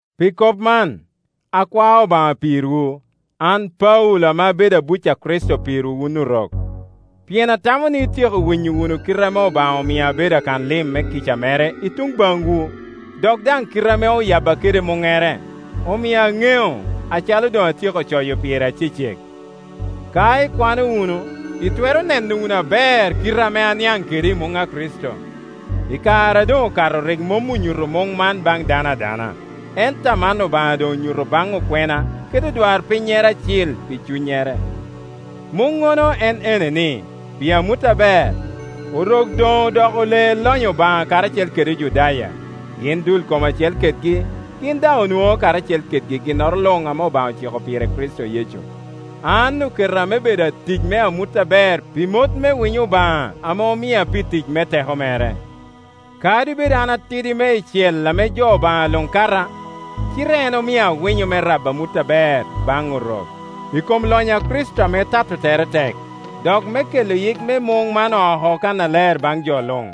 Pi kop man, akwao Obaŋa pirwu, an Paulo ame abedo abuc a Kricito pirwu wun Orok. Pien atamo ni ityeko winyo wunu kite ame Obaŋa omia abedo akanlim me kica mere i tuŋ baŋwu, dok daŋ kite ame oyabba kede muŋŋere, omia aŋeo, acalo doŋ atyeko coyo pire acecek. Ka ikwano wunu itwero neno wunu aber kite ame aniaŋ kede i muŋ a Kricito. I kare a doŋ okato rik mom onyuto muŋ man baŋ dano adana, ento aman Obaŋa doŋ onyuto baŋ okwena kede odwarpin-nyere acil pi Cunnyere. Muŋŋono en ene ni, pi amut aber, Orok doŋ odoko ole lonyo Obaŋa karacel kede Ojudaya, gin dul kom acel kedgi, gin daŋ onwoŋo karacel kedgi ginnoro luŋ ame Obaŋa ociko pire i Kricito Yecu. An oketa me bedo atic me amut aber pi mot me winyo Obaŋa ame omia pi tic me teko mere. Kadi bed an atidi meicel ame jo Obaŋa luŋ kata, cite en omia winyo man me rabo amut aber baŋ Orok, i kom lonyo a Kricito ame tato tere tek, dok me kelo yik me muŋ man oko kannaler baŋ jo luŋ.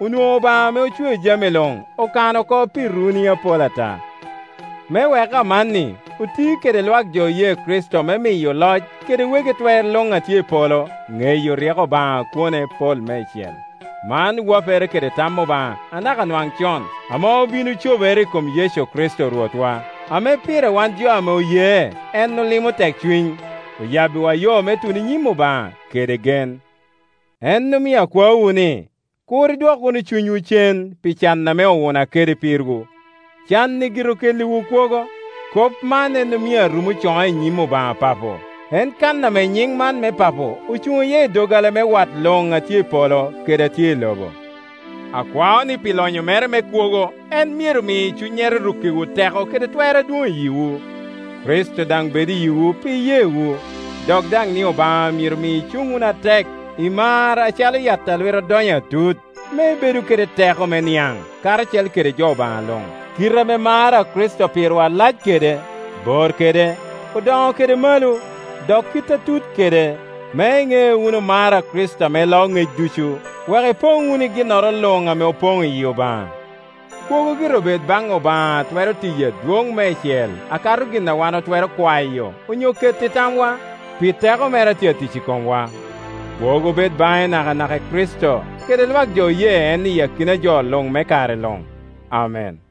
Onwoŋo Obaŋa ame ocweo jami luŋ okano pi runi apol ata, me wek amanni oti kede lwak jo oye Kricito me miyo oloc kede wegi twer luŋ a tye i polo ŋeyo ryeko Obaŋa a kwone pol meicel. Man wapere kede tam Obaŋa anaka nwaŋ con, ame obin, ocobere i kom Yecu Kricito Rwotwa, ame pire wan jo ame oye en olimo tekcuny, oyabbiwa yo me tuno i nyim Obaŋa kede gen. En omio akwaowu ni, kur idwok wunu cunywu cen pi can ame owuna kede pirwu; can-ni gire okelliwu kwogo. Kop man en omio arumo coŋa i nyim Obaŋa Papo, en kan ame nyiŋ man me papo ocuŋ iye i doggola me wat luŋ a tye i polo kede a tye i lobo. Akwao ni pi lonyo mere me kwogo en myero mi Cunnyere rukkiwu teko kede twer adwoŋ i yiwu. Kricito daŋ bed i yiwu pi iyewu; Dok daŋ ni Obaŋa myero mi icuŋ wunu atek i mar acalo yat a lwite odonyo atut, me ibedu kede teko me niaŋ, karacel kede jo Obaŋa luŋ, kite ame mar a Kricito pirwa lac kede, bor kede, odoŋo kede malo, dok kit a tut kede, me iŋe wunu mar a Kricito ame loo ŋec ducu, wek ipoŋ wunu i ginnoro luŋ ame opoŋ iyi Obaŋa. Kwogo gire obed baŋ Obaŋa a twero tiyo adwoŋ meicel a kato gin a wan otwero kwayo onyo keto i tamwa, pi teko mere a tye atic i komwa. Kwogo bed baŋe nakanaka i Kricito kede lwak jo oye en i akina jo luŋ me kare luŋ. Amen.